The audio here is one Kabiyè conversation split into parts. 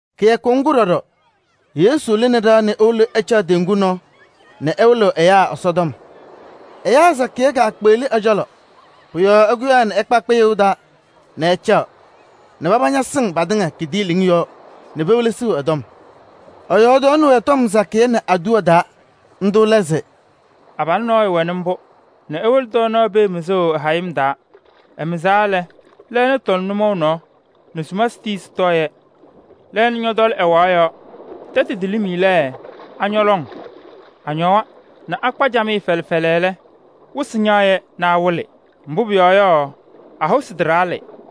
Kɩyakʋ ŋgʋ ɖɔɖɔ Yesu lɩnɩ ɖɩɣa nɛ ewolo ɛcaɣ teŋgu nɔɔ nɛ ɛwɩlɩɣ ɛyaa Ɛsɔtɔm. Ɛyaa samaɣ suwaɣ ɛ-cɔlɔ sɔsɔm. Pʋ-yɔɔ ɛkʋyaa ɛkpa kpɩyʋʋ taa nɛ ɛcaɣ nɛ paba ñasɩŋ patɩŋa kidiiliŋ yɔɔ nɛ pewelesiɣ ɛ-tɔm. Ɛyɔɔdaɣnɩ-wɛ tɔm sakɩyɛ nɛ aduwa taa. Ndʋ lɛ se: “Abalʋ nɔɔyʋ wɛnɩ mbʋ nɛ ewolo tɔɔnaɣ pee mɩzʋʋ ɛ-hayɩm taa. Ɛmɩzaɣ lɛ, lɛɛna tɔlɩ nʋmɔʋ nɔɔ nɛ sumasɩ tii sɩtɔɔ-yɛ. Lɛɛna ñɔtɔlɩ ɛwaɣ yɔɔ. Tɛtʋ telim lɛ, añɔ lɔŋ. Añɔwa nɛ akpa camɩyɛ fɛlɛ fɛlɛ lɛ, wɩsɩ ñaɣ nɛ awɩlɩ, mbʋ pʋyɔɔ yɔ, a-hosi taɖaɣlɩ.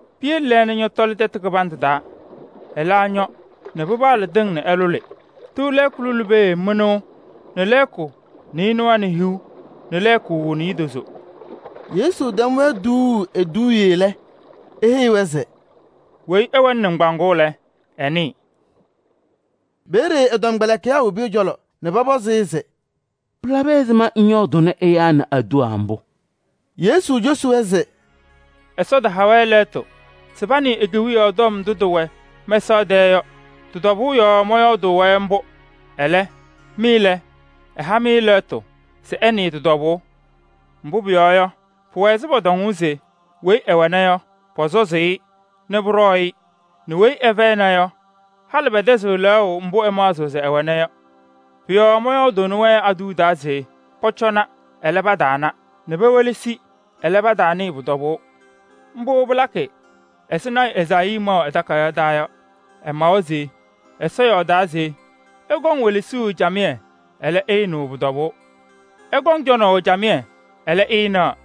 Piyele lɛɛna ñɔtɔlɩ tɛtʋ kɩbandʋ taa, alɛ ñɔ nɛ pɩpaɣlɩ tɩŋ nɛ ɩlʋlɩ. Tɩʋ lɛɛkʋ pee mɩnʋʋ nɛ lɛɛkʋ nɩɩnʋwa nɛ hiu nɛ lɛɛkʋ niidozo.” Yesu tɛm-wɛ tuuu eduuye lɛ, eheyi-wɛ se: “Weyi ɛwɛnɩ nɩŋgbaaŋ lɛ, ɛnɩɩ.” Peeye ɛ-tɔmkpɛlɩkɩyaa wobi ɛ-cɔlɔ nɛ pɔpɔzɩ-ɩ se: “Pɩlabɩ ɛzɩma ŋyɔɔdʋʋnɩ ɛyaa nɛ aduwa mbʋ?” Yesu cosi-wɛ se: “Ɛsɔ taha-wɛ lɛɣtʋ se panɩɩ e-Kewiyaɣ tɔm ndʋ tɩwɛ mɛsaɣ tɛɛ yɔ, tɩ-tɔbʋʋ yɔɔ mɔyɔɔdʋʋnɩ-wɛ mbʋ. Ɛlɛ, mɩ lɛ, ɛha-mɩ lɛɣtʋ se ɩnɩɩ tɩ-tɔbʋʋ. Mbʋ pʋyɔɔ yɔ, pʋwɛ ɛzɩ pɔtɔŋʋʋ se: ‘Weyi ɛwɛna, pɔsɔzɩ-ɩ nɛ pʋɖɔɔ-ɩ nɛ weyi ɛlɛ fɛyɩna yɔ, halɩ pɛtɛzɩɣ lɛɣʋ mbʋ ɛmaɣzɩɣ se ɛwɛna yɔ.’ Pʋ-yɔɔ mɔyɔɔdʋʋnɩ-wɛ nɛ aduwa se pɔcɔna, ɛlɛ, pataana, nɛ pewelesi, ɛlɛ, pataanɩɩ pʋ-tɔbʋʋ. Mbʋ pɩlakɩ ɛzɩ lɔɔyaɣ tʋ Ezaayii maʋ ɛ-takayaɣ taa yɔ. Ɛmawa se: ‘Ɩkɔŋ welesuu camɩyɛ, ɛlɛ, ɩɩnɩɣ pʋ-tɔbʋʋ. Ɩkɔŋ cɔnaʋ camɩyɛ, ɛlɛ, ɩɩnaɣ.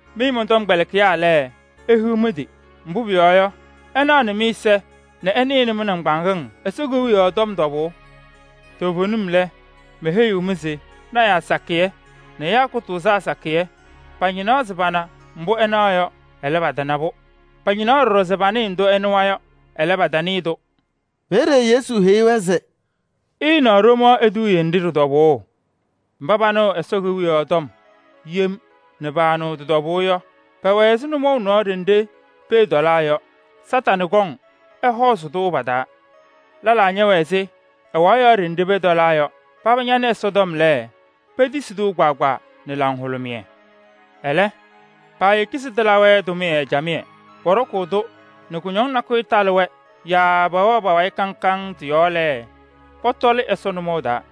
Mɩ mɔn-tɔmkpɛlɩkɩyaa lɛ, ihiɣ mɩ-tɩ! Mbʋ pʋyɔɔ yɔ, ɩnaɣnɩ mɩ-ɛza nɛ ɩnɩɣnɩ mɩ-nɩŋgbaaŋ Ɛsɔ Kewiyaɣ tɔm tɔbʋʋ. Toovenim lɛ, meheyiɣ-mɩ se lɔɔyɩsɩ tɩnaa sakɩyɛ nɛ ɛyaa kʋtʋʋzaa sakɩyɛ pañɩnaa se pana mbʋ ɩnaɣ yɔ, ɛlɛ, patana-pʋ. Pañɩnaa ɖɔɖɔ se panɩɩ ndʋ ɩnɩwa yɔ, ɛlɛ, patanɩɩ-tʋ.” Peeye Yesu heyi-wɛ se: “Ɩɩnaɣ ɖomaɣ eduuye nɖɩ ɖɩ-tɔbʋʋ: mba panɩɣ pɔyɔɔdʋʋ Ɛsɔ Kewiyaɣ tɔm yem nɛ paanɩɣ tɩ-tɔbʋʋ yɔ, pɛwɛ ɛzɩ nʋmɔʋ nɔɔ ɖenɖe pee tɔlaa yɔ. Kañadʋ Satanɩ kɔŋ ɛhɔɔzɩ-tʋ pa-taa. Lɛlaa ñɛwɛ ɛzɩ ɛwaɣ yɔɔ ɖenɖe pee tɔlaa yɔ. Paba nɩ Ɛsɔtɔm lɛ, petisi-tʋ kpaagbaa nɛ laŋhʋlʋmɩyɛ. Ɛlɛ, paayeki se tɩlabɩ-wɛ tʋmɩyɛ camɩyɛ. Pɔɖɔkʋʋ-tʋ nɛ kʋñɔŋ nakʋyʋ talɩ-wɛ yaa pɛwɛɛ pa-wayɩ kaŋ kaŋ tɩ-yɔɔ lɛ, pɔtɔlɩ Ɛsɔ nʋmɔʋ taa.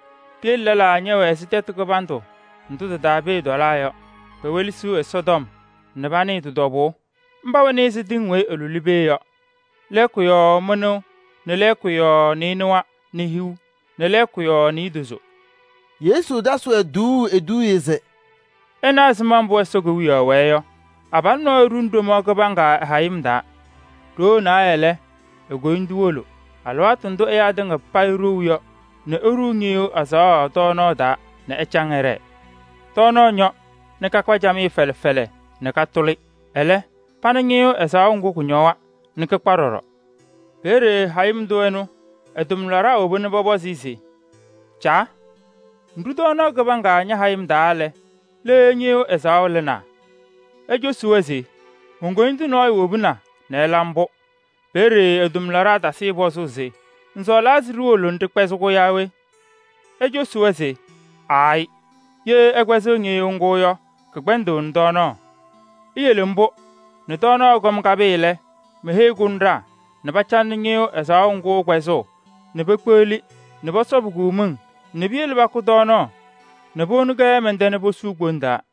Piyele lɛlaa ñɛwɛ ɛzɩ tɛtʋ kɩbandʋ ndʋ tɩ-taa pee tɔlaa yɔ. Pewelesiɣ Ɛsɔtɔm nɛ panɩɣ tɩ-tɔbʋʋ. Mba wɛnɩ ɛzɩ tɩŋ weyi ɩlʋlɩ pee yɔ: lɛɛkʋ yɔɔ mɩnʋʋ nɛ lɛɛkʋ yɔɔ nɩɩnʋwa nɛ hiu nɛ lɛɛkʋ yɔɔ niidozo.” Yesu tasɩ-wɛ tuuu eduuye se: “Ɩna ɛzɩma mbʋ Ɛsɔ Kewiyaɣ wɛɛ yɔ: abalʋ nɔɔyʋ ɖuni ɖomaɣ kɩbaŋga ɛ-hayɩm taa. Ɖoo naayɛ taa lɛ, e-koyindu wolo alɩwaatʋ ndʋ ɛyaa tɩŋa payɩ ɖou yɔ nɛ eɖuu ñɩyʋʋ ɛzaɣʋ tɔɔnaɣ taa nɛ ɛcaŋ ɛɖɛɛ. Tɔɔnaɣ ñɔ nɛ kakpa camɩyɛ fɛlɛ fɛlɛ nɛ katʋlɩ. Ɛlɛ, pana ñɩyʋʋ ɛzaɣʋ ŋgʋ, kʋñɔwa nɛ kɩkpa ɖɔɖɔ. Peeye hayɩm tʋ ɛnʋ ɛ-tʋmlaɖaa woba pɔpɔzɩ-ɩ se: ‘Caa! Ŋɖu ɖomaɣ kɩbaŋga ña-hayɩm taa lɛ, le ñɩyʋʋ ɛzaɣʋ lɩnaa?’ Ɛlɛ ecosi-wɛ se: ‘Mon-koyindu nɔɔyʋ wobina nɛ ɛla mbʋ.’ Peeye ɛ-tʋmlaɖaa tasɩ-ɩ pɔzʋʋ se: ‘Ŋsɔɔlaa se ɖiwolo ɖɩkpɛzɩ-kʋ yaa we?’ Ecosi-wɛ se: ‘Aayɩ! Ye ɩkpɛzɩɣ ñɩyʋʋ ŋgʋ yɔ, pɩkpɛndɩɣnɩ tɔɔnaɣ. Iyele mbʋ nɛ tɔɔnaɣ ɛkɔm kapɩɩ lɛ, meheyi kʋnɖaa nɛ pacalɩ ñɩyʋʋ ɛzaɣʋ ŋgʋ kpɛzʋʋ nɛ pekpeɣli nɛ pɔsɔbɩ-kʋ miŋ nɛ piyele pakʋ tɔɔnaɣ nɛ powoni-kɛ mɛn-tɛ nɛ posuu kpou taa.’”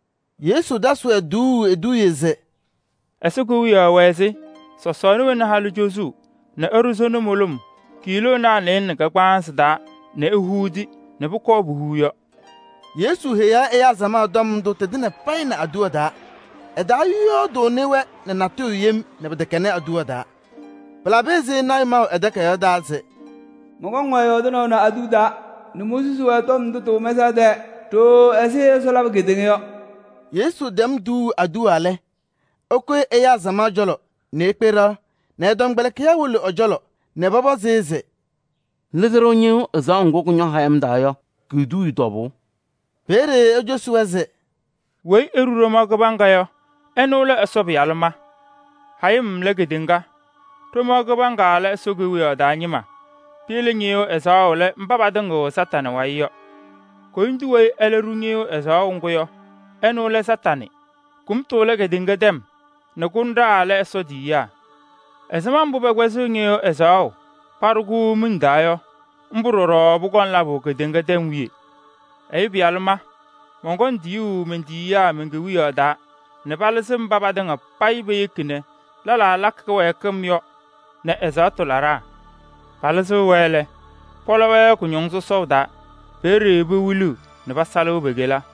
Yesu tasɩ-wɛ tuuu eduuye se: “Ɛsɔ Kewiyaɣ wɛ ɛzɩ sɔsɔɔna wena halʋ cozuu nɛ ɛɖʋ sona mʋlʋm kiiloonaa nɩɩlɛ nɛ kagbaanzɩ taa nɛ ehuudi nɛ pʋkɔɔ puhuu yɔ.” Yesu heyaɣ ɛyaa samaɣ tɔm ndʋ tɩtɩŋa payɩ nɛ aduwa taa. Ɛtɔyɔɔdʋʋnɩ-wɛ natʋyʋ yem nɛ pɩtɛkɛnɩ aduwa taa. Pɩlabɩ ɛzɩ lɔɔyaɣ tʋ maʋ ɛ-takayaɣ taa se: “Mɔnkɔŋ-wɛ yɔɔdɩnaʋ nɛ aduwa taa nɛ monsusi-wɛ tɔm ndʋ tɩwɛ mɛsaɣ tɛɛ ɖooo ɛzɩ Ɛsɔ labʋ kedeŋa yɔ.” Yesu tɛm tuuu aduwa lɛ, ɛkʋyɩ ɛyaa samaɣ cɔlɔ nɛ ekpe ɖɩɣa nɛ ɛ-tɔmkpɛlɩkɩyaa wolo ɛ-cɔlɔ nɛ pɔpɔzɩ-ɩ se: “Lɩzɩ-ɖʋ ñɩyʋʋ ɛzaɣʋ ŋgʋ kʋñɔ hayɩm taa yɔ ki-eduuye tɔbʋʋ.” Peeye ecosi-wɛ se: “Weyi eɖu ɖomaɣ kɩbaŋga yɔ, ɛnʋ lɛ Ɛyʋ Pɩyalʋ ma. Hayɩm lɛ kedeŋa. Ɖomaɣ kɩbaŋga lɛ Ɛsɔ Kewiyaɣ taa ñɩma. Piyele ñɩyʋʋ ɛzaɣʋ lɛ mba patɩŋɩɣ Kañadʋ Satanɩ wayɩ yɔ. Koyindu weyi ɛlɛ ɖu ñɩyʋʋ ɛzaɣʋ ŋgʋ yɔ, ɛnʋ lɛ Kañadʋ Satanɩ. Kʋmtʋ lɛ kedeŋa tɛm nɛ kʋnɖaa lɛ Ɛsɔ tiyiyaa. Ɛzɩma mbʋ pɛkpɛzɩɣ ñɩyʋʋ ɛzaɣʋ nɛ paɖʋ-kʋ miŋ yɔ, mbʋ ɖɔɖɔ pɔkɔŋ labʋ kedeŋa tɛm wiye. Ɛyʋ Pɩyalʋ ma, mɔnkɔŋ tiyuu men-tiyiyaa men-Kewiyaɣ taa nɛ palɩzɩ mba patɩŋa payɩ peyeki nɛ lɛlaa lakɩ kɩwɛɛkɩm yɔ nɛ ɛzaɣtʋ laɖaa. Palɩzɩɣ-wɛ lɛ, pɔlɔ-wɛ kʋñɔŋ sɔsɔʋ taa. Peeye pewiliɣ nɛ pasalɩ pe-kela.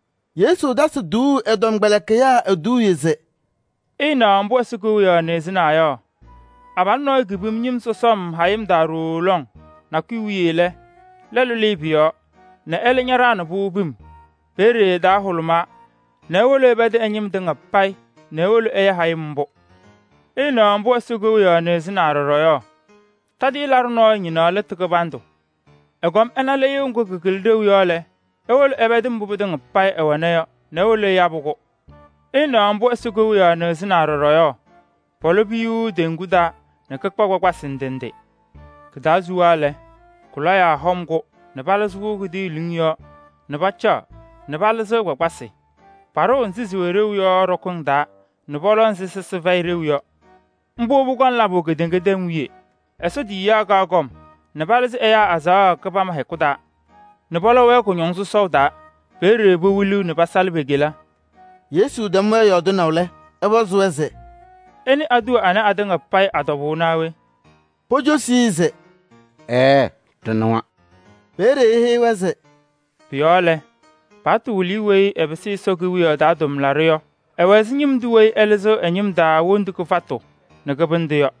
Yesu tasɩ tuuu ɛ-tɔmkpɛlɩkɩyaa eduuye se: “Ɩɩnaɣ mbʋ Ɛsɔ Kewiyaɣ nɩɣzɩnaa yɔ: abalʋ nɔɔyʋ kepimni ñɩm sɔsɔm hayɩm taa ɖooo lɔŋ. Nakʋyʋ wiye lɛ, lɛlʋ lɩɩ pʋ-yɔɔ nɛ ɛlɛ ɖaɣnɩ-pʋ pim. Peeye ɛ-taa hʋlʋmaa nɛ ewolo ɛpɛdɩ ɛ-ñɩm tɩŋa payɩ nɛ ewolo ɛyabɩ-pʋ.” “Ɩɩnaɣ mbʋ Ɛsɔ Kewiyaɣ nɩɣzɩnaa ɖɔɖɔ yɔ: tadɩyɛ laɖʋ nɔɔyʋ ñɩnaɣnɩ lɩtʋ kɩbandʋ. Ɛkɔm ɛna lɩyʋʋ ŋgʋ kɩkɩlɩ ɖeu yɔ lɛ, ewolo ɛpɛdɩ mbʋ pɩtɩŋa payɩ ɛwɛna yɔ nɛ ewolo ɛyabɩ-kʋ.” “Ɩɩnaɣ mbʋ Ɛsɔ Kewiyaɣ nɩɣzɩnaa ɖɔɖɔ yɔ: pɔlɔ piyuu teŋgu taa nɛ kɩkpaɣ kpakpasɩ ndɩ ndɩ. Kɩ-taa suwa lɛ, kʋ-lɔyaa hɔm-kʋ nɛ palɩzɩ-kʋ kidiiliŋ yɔɔ nɛ pacaɣ nɛ palɩzɩɣ kpakpasɩ. Paɖʋʋ nzɩ sɩwɛ ɖeu yɔ ɖɔkɩŋ taa nɛ pɔlɔ nzɩ sɩsɩ fɛyɩ ɖeu yɔ. Mbʋ pɔkɔŋ labʋ kedeŋa tɛm wiye. Ɛsɔ tiyiyaa kaɣ kɔm nɛ palɩzɩ ɛyaa azaɣa kɩbama hɛkʋ taa nɛ pɔlɔ-wɛ kʋñɔŋ sɔsɔʋ taa. Peeye pewiliɣ nɛ pasalɩ pe-kela.” Yesu tɛm-wɛ yɔɔdɩnaʋ lɛ, ɛpɔzɩ-wɛ se: “Ɩnɩ aduwa ana atɩŋa payɩ a-tɔbʋʋ naa we?” Pocosi-i se: “Ɛɛɛ! Ɖɩnɩwa.” Peeye eheyi-wɛ se: “Pʋ-yɔɔ lɛ, paɣtʋ wɩlɩyʋ weyi ɛpɩsɩ Ɛsɔ Kewiyaɣ taa tʋmlaɖʋ yɔ, ɛwɛ ɛzɩ ñɩm tʋ weyi ɛlɩzɩɣ ɛ-ñɩm taa wondu kɩfatʋ nɛ kɩbɩndʋ yɔ.”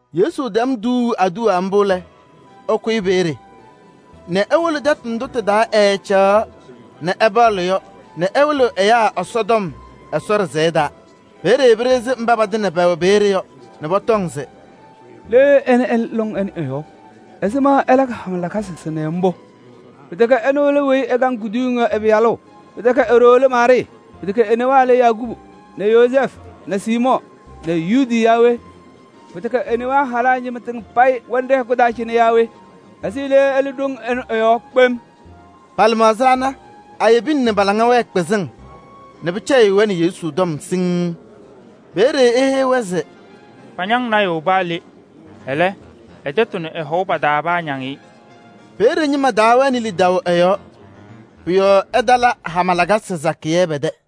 Yesu tɛm tuuu aduwa mbʋ lɛ, ɛkʋyɩ peeye nɛ ewolo tɛtʋ ndʋ tɩ-taa ɛɛcaɣaɣ nɛ ɛpaɣlɩ yɔ nɛ ɛwɩlɩɣ ɛyaa Ɛsɔtɔm Ɛsɔ ɖɩsɛyɛ taa. Peeye pɩɖɩɣzɩ mba patɩŋa pɛwɛ peeye yɔ nɛ pɔtɔŋ se: “Le ɛnɛ ɛlɩ lɔŋ ɛnʋ ɛ-yɔɔ? Ɛzɩma ɛlakɩ hama lakasɩ sɩnɛ mbʋ? Pɩtɛkɛ ɛnʋ lɛ weyi ɛkaŋ kuduyiŋ yɔ ɛ-pɩyalʋ? Pɩtɛkɛ e-ɖoo lɛ Maarɩɩ? Pɩtɛkɛ e-newaa lɛ Yakubu nɛ Yozɛɛfʋ nɛ Siimɔɔ nɛ Yuudi yaa we? Pɩtɛkɛ e-newaa halaa ñɩma tɩŋa payɩ wɛnɩ ɖɛ-hɛkʋ taa cɩnɛ yaa we? Ɛzɩ le ɛlɩ ɖoŋ ɛnʋ ɛ-yɔɔ kpem?” Pa-lɩmaɣza ana ayebina nɛ pa-laŋa wɛɛ kpɩzɩŋ nɛ pɩcɛyɩɣ-wɛ nɛ Yesu tɔm siŋŋ. Peeye eheyi-wɛ se: “Pañaŋ lɔɔyaɣ tʋ paa le. Ɛlɛ, ɛ-tɛtʋ nɛ ɛ-hɔʋ pa-taa paañaŋ-ɩ.” Peeye ñɩma taawɛnɩ lidaʋ ɛ-yɔɔ, pʋ-yɔɔ ɛtala hama lakasɩ sakɩyɛ pɛ-tɛ.